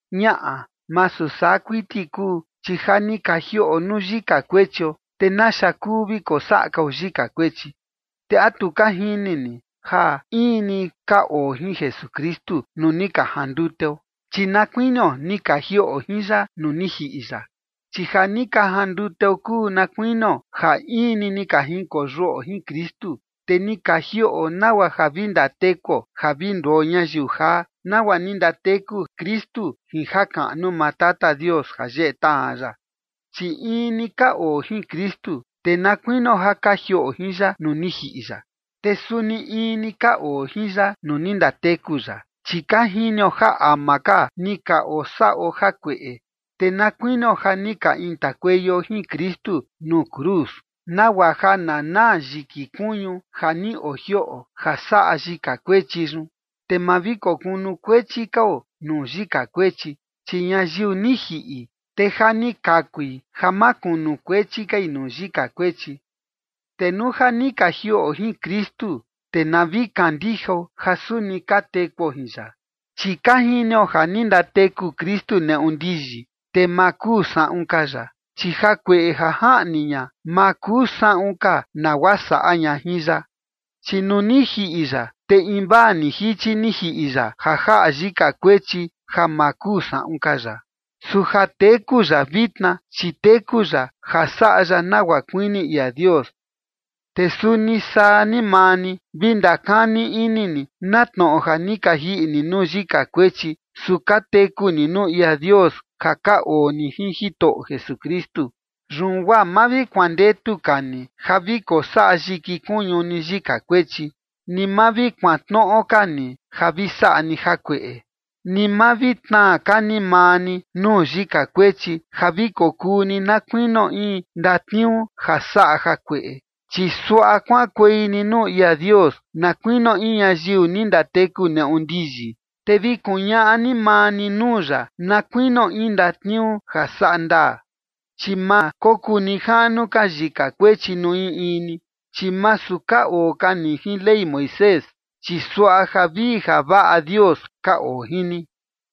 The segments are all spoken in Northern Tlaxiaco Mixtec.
Ñaꞌa, masu saa kuiti kuu. Chi ja ni ka jiꞌo nuu yika kuechio, te ¿naxa kuu vi kosaꞌa kao yika kuechi? ¿Te a tu ka jini ni ja in ni ka oo jin Jesukristu nuu ni ka janduteo? Chi na kuinio ni ka jiꞌo jin ya nuu ni jiꞌi ya. Chi ja ni ka janduteo kuu na kuinio ja in ni ni ka junkoyuꞌo jin Kristu, te ni ka jiꞌo nagua ja vi ndatekuo ja vi nduo ñayiu jaa, nagua ni ndateku Kristu jin jakaꞌnu maa Tata Dios ja yeꞌe tajan ya. Chi in ni ka oo jin Kristu, te na kuinio ja ka jiꞌo jin ya nuu ni jiꞌi ya, te suni in ni ka oo jin ya nuu ni ndateku ya. Chi ka jinio ja ama ka ni ka osaꞌo jakueꞌe, te na kuinio ja ni ka intakueio jin Kristu nuu cruz, nagua ja na naa yiki kuñu ja ni ojioꞌo ja saꞌa yika kuechi yun, te ma vi kokunukuechi kao nuu yika kuechi. Chi ñayiu ni jiꞌi, te ja ni kakui ja ma kunukuechi kai nuu yika kuechi. Te nuu ja ni ka jiꞌo jin Kristu, te na vi kandijao ja suni ka tekuo jin ya. Chi ka jinio ja ni ndateku Kristu neꞌu ndiyi, te ma kuu saꞌun ka ya, chi jakueꞌe ja jaꞌni ña, ma kuu saꞌun ka nagua saꞌa ña jin ya. Chi nuu ni jiꞌi ya, te invaa ni jichi ni jiꞌi ya ja jaꞌa yika kuechi ja ma kuu saꞌun ka ya. Su ja teku ya vitna, chi teku ya ja saꞌa ya nagua kuini ia Dios. Te suni saa ni maa ni, vi ndakani ini ni na tnoꞌo ja ni ka jiꞌi ni nuu yika kuechi, su ka teku ni nuu ia Dios ja ka oo ni jin Jitoꞌo Jesukristu. Yun guaa ma vi kuandetu ka ni ja vi kosaꞌa yiki kuñu ni yika kuechi, ni ma vi kuantnoꞌo ka ni ja vi saꞌa ni jakueꞌe. Ni ma vi tnaa ka ni maa ni nuu yika kuechi ja vi kokuu ni na kuinio in ndatniuu ja saꞌa jakueꞌe, chi suaꞌa kuaꞌankuei ni nuu ia Dios na kuinio in ñayiu ni ndateku neꞌu ndiyi, te vi kuñaꞌa ni maa ni nuu ya na kuinio in ndatniuu ja saꞌa ndaa. Chi ma kokuu nijaꞌnu ka yika kuechi nuu in in ni, chi masu ka oo ka ni jin Ley Moisés, chi suaꞌa javii javaꞌa Dios ka oo jin ni.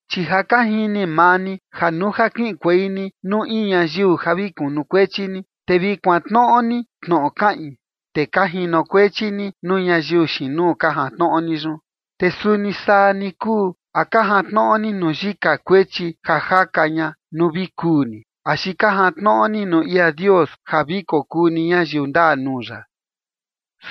Chi ja ka jini maa ni, ja nuu ja kiꞌinkuei ni nuu in ñayiu ja vi kunukuechi ni, te vi kuantnoꞌo ni tnoꞌo kaꞌin, te ka jinokuechi ni nuu ñayiu xiin nuu ka jantnoꞌo ni yun. Te suni saa ni kuu, ¿a ka jantnoꞌo ni nuu yika kuechi ja jaka ña nuu vi kuu ni, axi ka jantnoꞌo ni nuu ia Dios ja vi kokuu ni ñayiu ndaa nuu ya?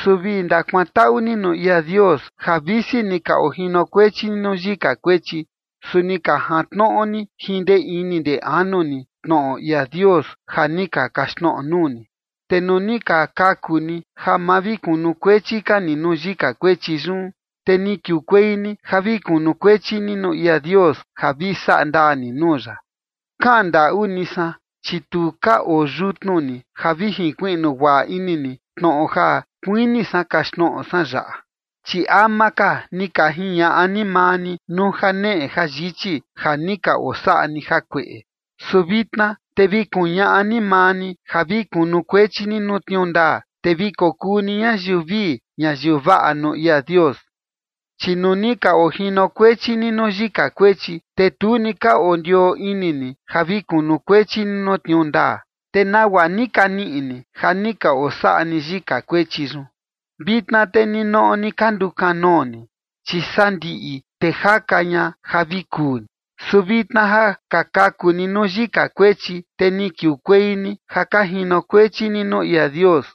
Su vi ndakuantaꞌu ni nuu ia Dios, ja visi ni ka ojinokuechi ni nuu yika kuechi, su ni ka jantnoꞌo ni jin ndee ini ndee anu ni tnoꞌo ia Dios ja ni ka kaxtnoꞌo nuu ni. Te nuu ni ka kaku ni ja ma vi kunukuechi ka ni nuu yika kuechi yun, te ni kiukuei ni ja vi kunukuechi ni nuu ia Dios ja vi saꞌa ndaa ni nuu ya. Kaꞌan ndaꞌu ni san, chi tu ka oo yutnu ni ja vi jinkuiꞌnu guaꞌa ini ni tnoꞌo ja kuini san kaxtnoꞌo san yaꞌa. Chi ama ka ni ka jiñaꞌa ni maa ni nuu janeꞌe jayichi ja ni ka osaꞌa ni jakueꞌe. Su vitna te vi kuñaꞌa ni maa ni ja vi kunukuechi ni nuu tniuu ndaa, te vi kokuu ni ñayiu vii ñayiu vaꞌa nuu ia Dios. Chi nuu ni ka ojinokuechi ni nuu yika kuechi, te tu ni ka ondioo ini ni ja vi kunukuechi ni nuu tniuu ndaa. ¿Te nagua ni ka niꞌi ni ja ni ka osaꞌa ni yika kuechi yun? Vitna te ninoꞌo ni ka ndukanoo ni, chi sandiꞌi te jaka ña ja vi kuu ni. Su vitna ja ni ka kaku ni nuu yika kuechi, te ni kiukuei ni ja ka jinokuechi ni nuu ia Dios.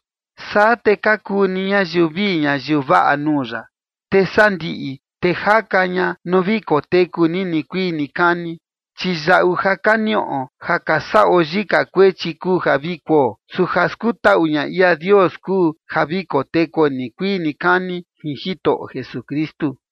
Saa te ka kuu ni ñayiu vii ñayiu vaꞌa nuu ya, te sandiꞌi te jaka ña nuu vi koteku ni nikuii nikani. Chi yaꞌu ja ka niꞌo ja ka saꞌo yika kuechi kuu ja vi kuo, su ja skutaꞌu ña ia Dios kuu ja vi kotekuo nikuii nikani jin Jitoꞌo Jesukristu.